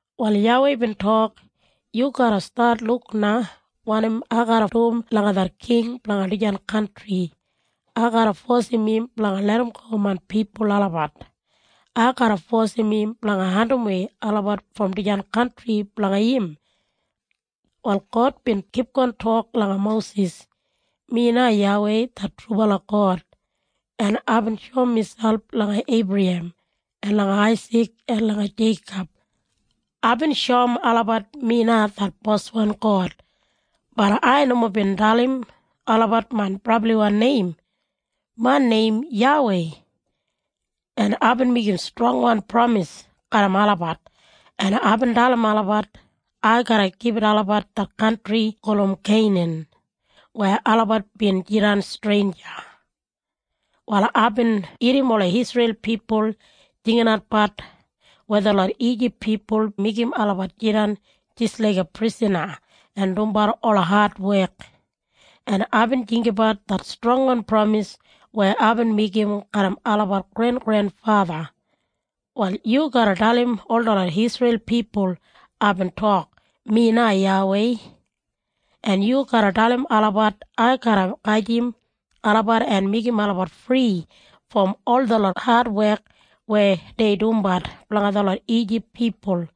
Wal YAWEI bin tok, “Yu garra stat luk na wanim ai garra dum langa det king blanga dijan kantri. Ai garra fosim im blanga larramgo main pipul olabat. Ai garra fosim im blanga andimwei olabat brom dijan kantri blanga im.” Wal God bin kipgon tok langa Mosis, “Mi na YAWEI det trubala God, en aibin shoum miselp langa Eibrahem en langa Aisik en langa Jeikob. Aibin shoum olabat mi na det boswan God. Bat ai nomo bin dalim olabat main brabliwan neim. Main neim YAWEI. En aibin meigim strongwan pramis garram olabat, en aibin dalim olabat ai garra gibit olabat det kantri gulum Keinan weya olabat bin jidan streinja. “Wal aibin irrim ola Isreil pipul jinginatbat weya detlot Ijip pipul meigim olabat jidan jis laiga prisana en dumbat ola adwek, en aibin jinggabat det strongwan pramis weya aibin meigim garram olabat grengrenfatha. “Wal yu garra dalim ol detlot Isreil pipul aibin tok, ‘Mi na YAWEI.’ En yu garra dalim olabat ai garra gajim olabat en meigim olabat fri brom ol detlot adwek weya dei dumbat blanga detlot Ijip pipul.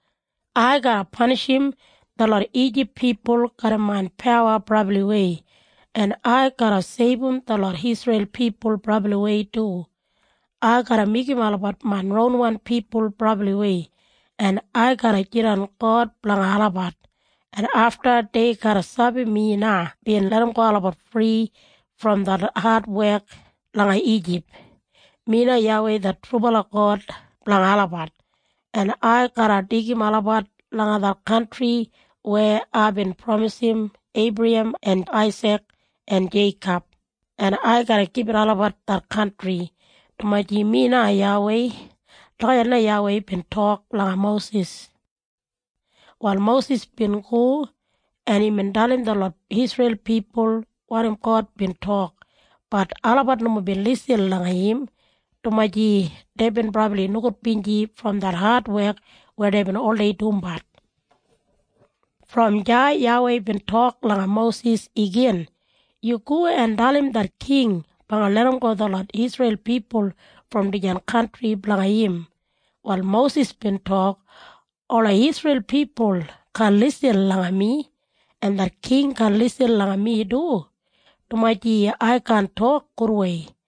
Ai garra panishim detlot Ijip pipul garram main pawa brabliwei, en ai garra seibum detlot Isreil pipul brabliwei du. Ai garra meigim olabat main ronwan pipul brabliwei, en ai garra jidan God blanga olabat, en afta dei garra sabi mi na bin larramgo olabat fri brom det adwek langa Ijip. Mi na YAWEI det God blanga olabat, en ai garra deigim olabat langa det kantri weya aibin pramisim Eibrahem en Aisik en Jeikob, en ai garra gibit olabat det kantri, dumaji mi na YAWEI.” Lagijat na YAWEI bin tok langa Mosis. Wal Mosis bin go, en imbin dalim detlot Isreil pipul wanim God bin tok. Bat olabat nomo bin lisin langa im, dumaji deibin brabli nogudbinji brom det adwek weya deibin oldei dumbat. Brom deya YAWEI bin tok langa Mosis igin, “Yu go en dalim det king blanga larramgo detlot Isreil pipul brom dijan kantri blanga im.” Wal Mosis bin tok, “Ola Isreil pipul kaan lisin langa mi. En det king kaan lisin langa mi du, dumaji ai kaan tok gudwei.”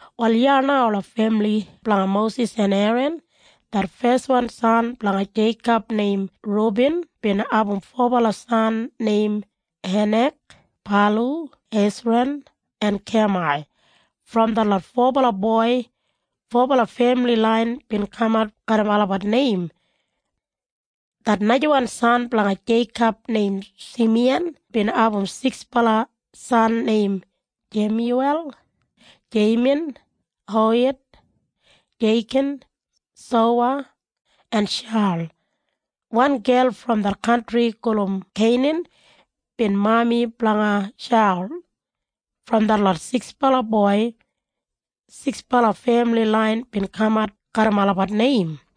Wal iya na ola femili blanga Mosis en Eran. Det feswan san blanga Jeikob neim Rubin bin abum fobala san neim Henak, Palu, Hesran en Kamai. Brom detlot fobala boi, fobala femili lain bin kamat garram olabat neim. Det najawan san blanga Jeikob neim Simiyan bin abum siksbala san neim Jemyuwel, Jeimin, Ohed, Jeikin, Soha en Shaul. Wan gel brom det kantri gulum Keinan bin mami blanga Shaul. Brom detlot siksbala boi, siksbala femili lain bin kamat garram olabat neim.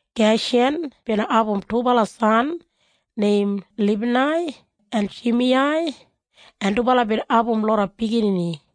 Geshan bin abum dubala san neim Libnai en Shimiyai, en dubala bin abum loda biginini.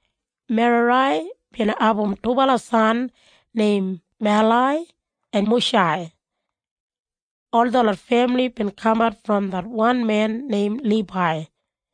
Merarai bin abum dubala san neim Malai en Mushai. Ol detlot femili bin kamat brom det wan men neim Libai.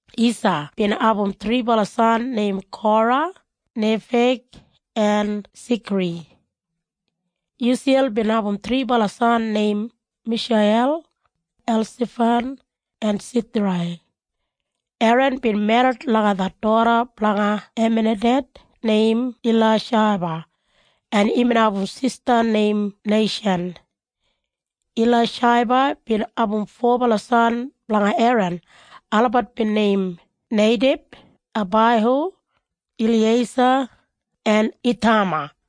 Isa bin abum thribala san neim Kora, Nefeg en Sikri. Yusiyel bin abum thribala san neim Misheiyel, Elsafan en Sithrai. Eran bin merrit langa det doda blanga Aminadeb neim Ilaishaba, en imbin abum sista neim Neishan. Ilaishaba bin abum fobala san blanga Eran. Olabat bin neim Neideb, Abaihu, Eliyeisa en Ithama.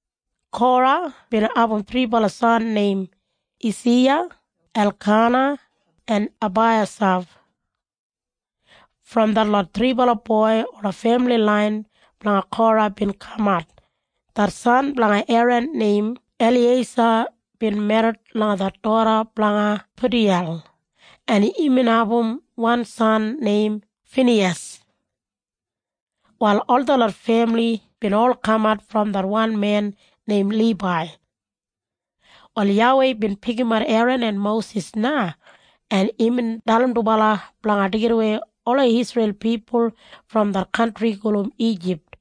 Kora bin abum thribala san neim Esiya, Elkana en Abaiyasaf. Brom detlot thribala boi ola femili lain blanga Kora bin kamat. Det san blanga Eran neim Eliyeisa bin merrit langa det doda blanga Putiyel, en imbin abum wan san neim Finiyas. Wal ol detlot femili bin ol kamat brom det wan men neim Libai. Wal YAWEI bin pikimat Eran en Mosis na, en imbin dalim dubala blanga deigidawei ola Isreil pipul brom det kantri gulum Ijip,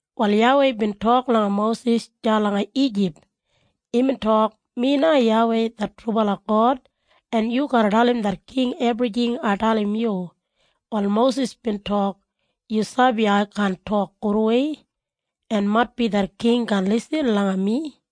Wal YAWEI bin tok langa Mosis deya langa Ijip. Imbin tok, “Mi na YAWEI det trubala God, en yu garra dalim det king ebrijing ai dalim yu.” Wal Mosis bin tok, “Yu sabi ai kaan tok gudwei. En maitbi det king kaan lisin langa mi.”